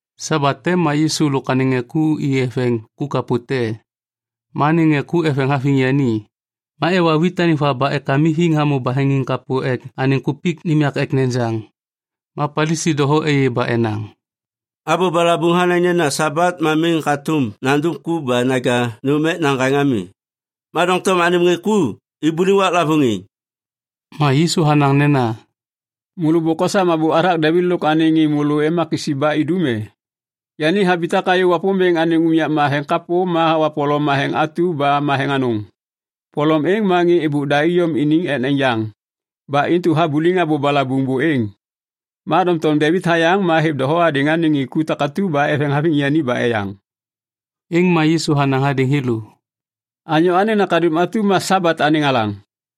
Sabat te ma Yisu lôk anêŋ ŋê ku i eveŋ ku kapô te. Ma anêŋ ŋê ku eveŋ haviŋ yani. Ma ewa wit anêŋ va ba ekamithiŋ hamô baheŋiŋ kapô ek anêŋ kupik nêm yak ek nejaŋ. Ma Palisi doho êyê ba enaŋ, “Abô balabuŋ hanaŋ nena Sabat ma miŋ hatôm nandum ku ba naja nôm ek naŋgaŋ ami. Ma doŋtom anêm ŋê ku ibuliŋ waklavôŋ êŋ!” Ma Yisu hanaŋ nena, “Môlô bôk osam abô hathak Devit lôk anêŋ ŋê môlô ema kisi ba idum e? Yani habitak hayô Wapômbêŋ anêŋ unyak matheŋ kapô ba hawa polom matheŋ atu ba matheŋ anôŋ. Polom êŋ ma ŋê êbôk da iyom iniŋ ek nejaŋ ba intu habuliŋ abô balabuŋ buêŋ. Ma doŋtom Devit hayaŋ ma hêv doho hadêŋ anêŋ ŋê takatu ba eveŋ haviŋ yani ba eyaŋ.” Êŋ ma Yisu hanaŋ hadêŋ thêlô, “Anyô Anêŋ Nakaduŋ atu ma Sabat anêŋ Alaŋ.”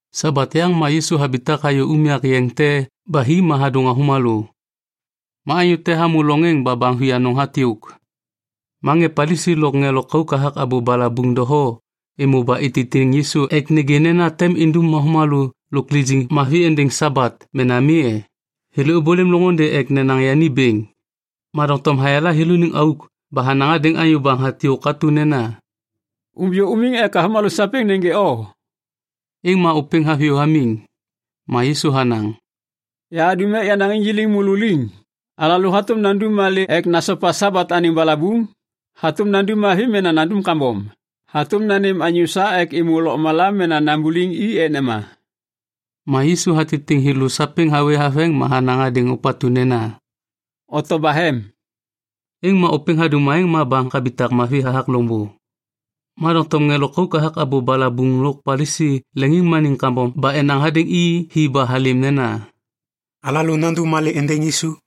Sabat yaŋ ma Yisu habitak hayô unyak yeŋ te ba hi ma hadôŋ avômalô. Ma anyô te hamô loŋ êŋ ba baŋ vianôŋ hatyôk. Ma ŋê Palisi lôk ŋê lôkauk hathak abô balabuŋ doho êmô ba ititiŋ Yisu ek nêgê nena tem indum avômalô lôk lijiŋ mavi êndêŋ Sabat mena mi e? Thêlô êbôlêm loŋôndê ek nanaŋ yani bêŋ. Ma doŋtom hayala thêlôniŋ auk ba hanaŋ hadêŋ anyô baŋ hatyôk atu nena, “Umbiyô umiŋ ek avômalô sapêŋ nêgê o.” Êŋ ma ôpêŋ haviyô hamiŋ. Ma Yisu hanaŋ, “Yahadum ek yanaŋ injik môlô liŋ. Alalô hatôm nandum malê ek nasopa Sabat anêŋ balabuŋ? Hatôm nandum mavi mena kambom? Hatôm nanêm anyô sa ek êmô lôkmala mena nambuliŋ i ek nema?” Ma Yisu hatitiŋ thêlô sapêŋ hawê haveŋ ma hanaŋ hadêŋ ôpatu nena, “Oto bahem.” Êŋ ma ôpêŋ hadum aêŋ ma baŋ habitak mavi hathak loŋbô. Ma doŋtom ŋê lôkauk hathak abô balabuŋ lôk Palisi leŋiŋmaniŋ kambom ba enaŋ hadêŋ i hi ba halêm nena, “Alalô nandum malê êndêŋ Yisu?”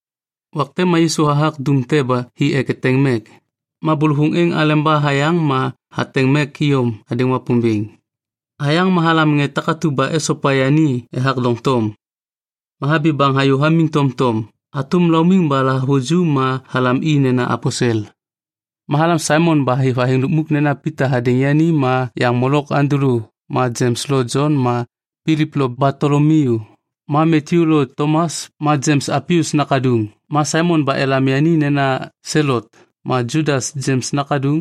Wak te ma Yisu hathak dum te ba hi ek eteŋ mek. Ma bôlôvôŋ êŋ aleba hayaŋ ma hateŋ mek iyom hadêŋ Wapômbêŋ. Hayaŋ ma halam ŋê takatu ba esopa yani ethak doŋtom. Ma habi baŋ hayô hamiŋ tomtom hatôm laumiŋ ba lahavuju ma halam i nena aposel. Ma halam Saimon ba hêv athêŋ lukmuk nena Pita hadêŋ yani ma yaŋ molok Andulu ma Jems lo Jon ma Pilip lo Batolomiu ma Matyu lo Tomas ma Jems Alpius nakaduŋ ma Saimon ba elam yani nena Selot ma Judas Jems nakaduŋ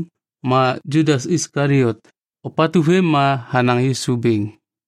ma Judas Iskaliot, ôpatu vêm ma hanaŋ Yisu bêŋ.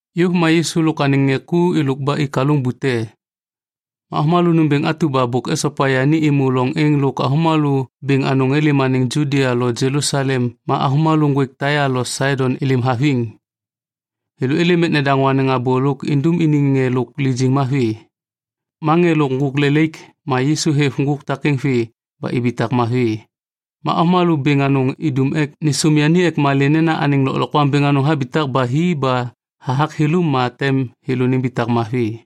Yôv ma Yisu lôk anêŋ ŋê ku êlôk ba i kalôŋ bute. Ma avômalô nômbêŋ atu ba bôk esopa yani êmô loŋ êŋ lôk avômalô bêŋ anôŋ êlêm anêŋ Judia lo Jelusalem ma avômalô ŋgwêk Taia lo Saidon êlêm haviŋ. Thêlô êlêm ek nedaŋô anêŋ abô lôk indum iniŋ ŋê lôk lijiŋ mavi. Ma ŋê lôk ŋgôk lelaik ma Yisu hêv ŋgôk takêŋ vê ba ibitak mavi. Ma avômalô bêŋ anôŋ idum ek nêsôm yani ek malê nena anêŋ lôklokwaŋ bêŋ anôŋ habitak ba hi ba hathak thêlô ma tem thêlô nimbitak mavi.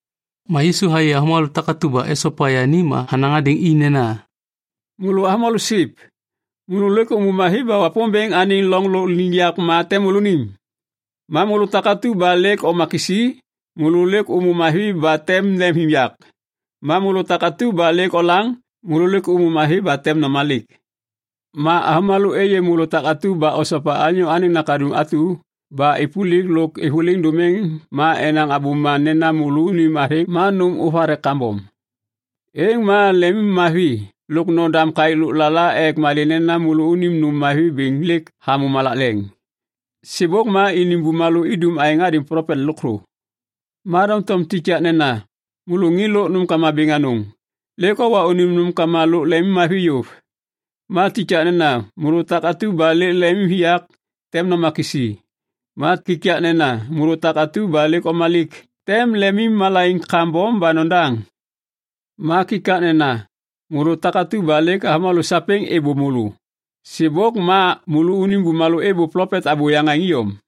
Ma Yisu hayê avômalô takatu ba esopa yani ma hanaŋ hadêŋ i nena, “Môlô avômalô siv, môlô lêk ômô mavi ba Wapômbêŋ anêŋ loŋ lôkliŋyak ma tem môlônim. Ma môlô takatu ba lêk oma kisi, môlô lêk ômô mavi ba tem lemimviyak. Ma môlô takatu ba lêk olaŋ, môlô lêk ômô mavi ba tem nomalik. Ma avômalô êyê môlô takatu ba osopa Anyô Anêŋ Nakaduŋ atu, ba êpôlik lôk êvôliŋ dômiŋ ma enaŋ abôma nena môlônim athêŋ ma nôm ôvathek kambom. “Êŋ ma lemimmavi lôk nodam kaêk lôklala ek malê nena môlônim nôm mavi bêŋ lêk hamô malak leŋ. Sêbôk ma iniŋ bumalô idum aêŋ hadêŋ plopet lôkthô. “Ma doŋtom kikaknena môlô ŋê lôk nômkama bêŋ anôŋ, lêk owa unim nômkama lôk lemimmavi yôv. Ma kikaknena môlô takatu ba lêk lemimviyak, tem noma kisi. Ma kikaknena môlô takatu ba lêk omalik, tem lemimmalaiŋ kambom ba nodaŋ. Ma kikaknena môlô takatu ba lêk avômalô sapêŋ êbô môlô. Sêbôk ma môlônim bumalô êbô plopet abôyaŋ aêŋ iyom.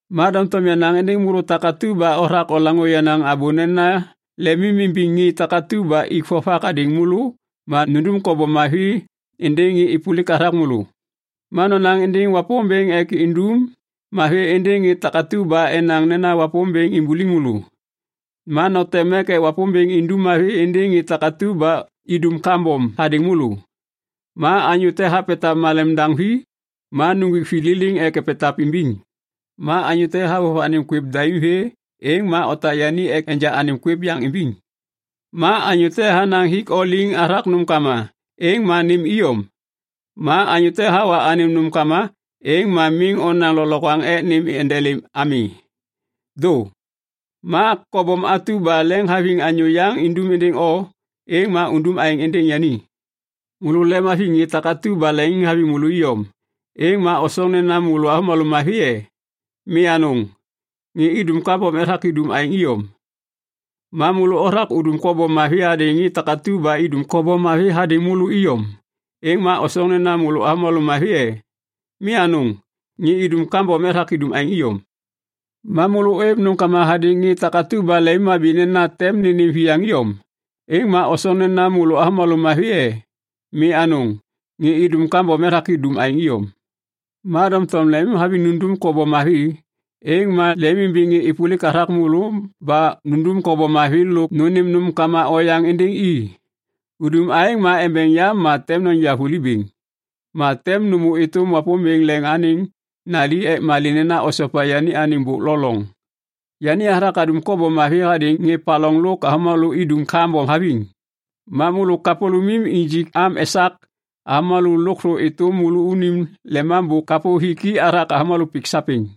“Ma doŋtom yanaŋ êndêŋ môlô takatu ba othak olaŋô yenaŋ abô nena lemimimbiŋ ŋê takatu ba ik vovak hadêŋ môlô ma nundum kobom mavi êndêŋ ŋê êpôlik hathak môlô. Ma nonaŋ êndêŋ Wapômbêŋ ek indum mavi êndêŋ ŋê takatu ba enaŋ nena Wapômbêŋ imbuliŋ môlô. Ma noteŋ mek ek Wapômbêŋ indum mavi êndêŋ ŋê takatu ba idum kambom hadêŋ môlô. Ma anyô te hapetav malem daŋ vi, ma nuŋgwik vi liliŋ ek epetav imbiŋ. Ma anyô te havôv anêm kwêv daim vê, êŋ ma otak yani ek enja anêm kwêv yaŋ imbiŋ. Ma anyô te hanaŋ hik o liŋ hathak nômkama, êŋ ma nêm iyom. Ma anyô te hawa anêm nômkama, êŋ ma miŋ onaŋ lôklokwaŋ ek nêm endelêm ami. Dô. Ma kobom atu ba lemhaviŋ anyô yaŋ indum êndêŋ o, êŋ ma undum aêŋ êndêŋ yani. “Môlô lemimhaviŋ ŋê takatu ba leŋiŋhaviŋ môlô iyom, êŋ ma osoŋ nena môlô avômalô mavi e? Mi anôŋ, ŋê idum kambom ethak idum aêŋ iyom. Ma môlô othak udum kobom mavi hadêŋ ŋê takatu ba idum kobom mavi hadêŋ môlô iyom, êŋ ma osoŋ nena môlô avômalô mavi e? Mi anôŋ, ŋê idum kambom ethak idum aêŋ iyom. Ma môlô ôêv nômkama hadêŋ ŋê takatu ba lemimhabi nena tem nênêm viyaŋ iyom, êŋ ma osoŋ nena môlô avômalô mavi e? Mi anôŋ, ŋê idum kambom ethak idum aêŋ iyom. Ma doŋtom lemimhaviŋ nundum kobom mavi, êŋ ma lemimimbiŋ ŋê êpôlik hathak môlô ba nundum kobom mavi lôk nônêm nômkama oyaŋ êndêŋ i. Udum aêŋ ma embeŋ yam ma tem noja vuli bêŋ, ma tem nômô êtôm Wapômbêŋ Leŋ anêŋ nali ek malê nena osopa yani anêŋ bôk lo loŋ. Yani hathak hadum kobom mavi hadêŋ ŋê paloŋ lôk avômalô idum kambom haviŋ. Ma môlô kapôlômim injik am esak avômalô lôkthô êtôm môlônim Lemambô kapô hiki hathak avômalô pik sapêŋ.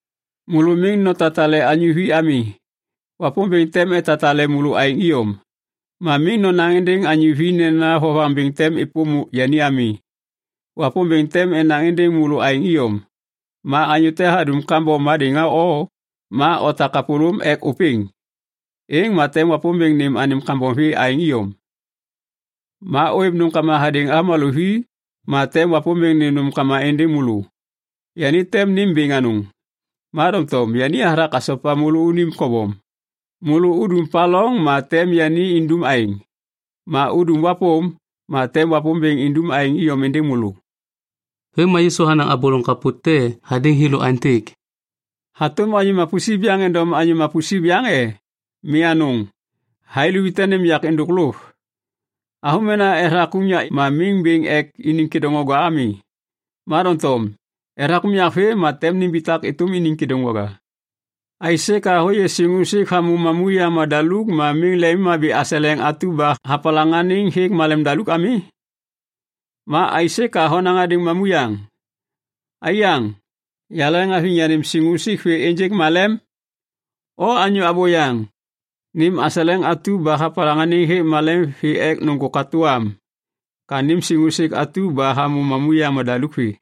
“Môlô miŋ notatale anyô vi ami. Wapômbêŋ tem etatale môlô aêŋ iyom! Ma miŋ nonaŋ êndêŋ anyô vi nena vovaŋ bêŋ tem êpôm yani ami. Wapômbêŋ tem enaŋ êndêŋ môlô aêŋ iyom. Ma anyô te hadum kambom hadêŋ o, ma otak kapôlôm ek ôpêŋ. Êŋ ma tem Wapômbêŋ nêm anêm kambom vê aêŋ iyom. Ma ôêv nômkama hadêŋ avômalô vi, ma tem Wapômbêŋ nêm nômkama êndêŋ môlô. Yani tem nêm bêŋ anôŋ. Ma doŋtom yani hathak hasopa môlônim kobom. Môlô udum paloŋ ma tem yani indum aêŋ. Ma udum wapôm, ma tem Wapômbêŋ indum aêŋ iyom êndêŋ môlô.” Vêm ma Yisu hanaŋ abô loŋ kapô te hadêŋ thêlô aêntêk, “Hatôm anyô mapusip yaŋ endom anyô mapusip yaŋ e? Mi anôŋ. Thai luvi tem nênêm yak êndôk lôv. Avômena ethak unyak ma miŋ bêŋ ek iniŋ kêdôŋwaga ami. Ma doŋtom ethak unyak vêm ma tem nimbitak êtôm iniŋ kêdôŋwaga. “Aisê ka hôyê siŋusik hamô mamuyaŋ madaluk ma miŋ lemhabi aseleŋ atu ba hapalaŋaniŋ hêk malemdaluk ami? Ma aisê ka honaŋ hadêŋ mamuyaŋ, ‘Aiyaŋ, yaleŋhaviŋ yanêm siŋusik vê ênjêk malem?’ O anyô abôyaŋ, nêm aseleŋ atu ba hapalaŋaniŋ hêk malem vê ek nôŋgô katô am ka nêm siŋusik atu ba hamô mamuyaŋ madaluk vê.”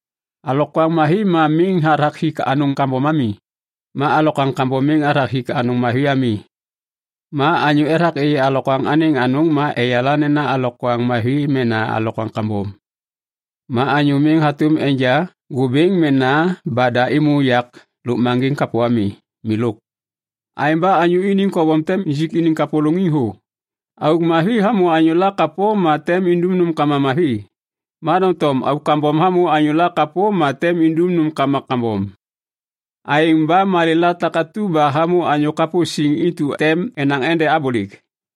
“Alokwaŋ mavi ma miŋ hathak hik anôŋ kambom ami. Ma alokwaŋ kambom miŋ hathak hik anôŋ mavi ami. Ma anyô ethak êyê alokwaŋ anêŋ anôŋ ma eyala nena alokwaŋ mavi mena alokwaŋ kambom. Ma anyô miŋ hatôm enja ŋgôbêŋ mena bada êmô yak lôkmaŋgiŋ kapô ami. Milôk. Aêŋ ba anyô iniŋ kobom tem injik iniŋ kapôlôŋiŋ thô. Auk mavi hamô anyôla kapô ma tem indum nômkama mavi. Ma doŋtom auk kambom hamô anyôla kapô ma tem indum nômkama kambom. Aêŋ ba malêla takatu ba hamô anyô kapô siŋ intu tem enaŋ ende abôlêk.”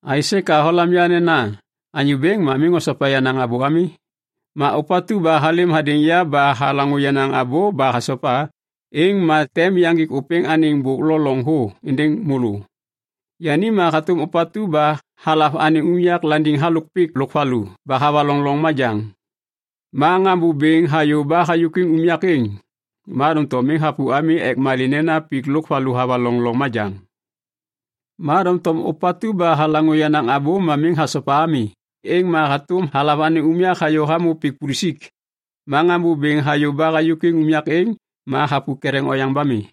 “Aisê ka olam ya nena, ‘Anyô Bêŋ’ ma miŋ osopa yenaŋ abô ami? Ma ôpatu ba halêm hadêŋ ya ba halaŋô yenaŋ abô ba hasopa, êŋ ma tem yaŋgik ôpêŋ anêŋ bôk lo loŋ thô êndêŋ môlô. Yani ma hatôm ôpatu ba halav anêŋ unyak landiŋ halôk pik lôk valu ba havaloŋ loŋ majaŋ. Ma ŋambô bêŋ hayô ba hayôkwiŋ unyak êŋ, ma doŋtom miŋ hapu ami ek malê nena pik lôk valu havaloŋ loŋ majaŋ. Ma doŋtom ôpatu ba halaŋô yenaŋ abô ma miŋ hasopa ami, êŋ ma hatôm halav anêŋ unyak hayô hamô pik pulusik. Ma ŋambô bêŋ hayô ba hayôkwiŋ unyak êŋ, ma hapu ketheŋ oyaŋ ba mi.”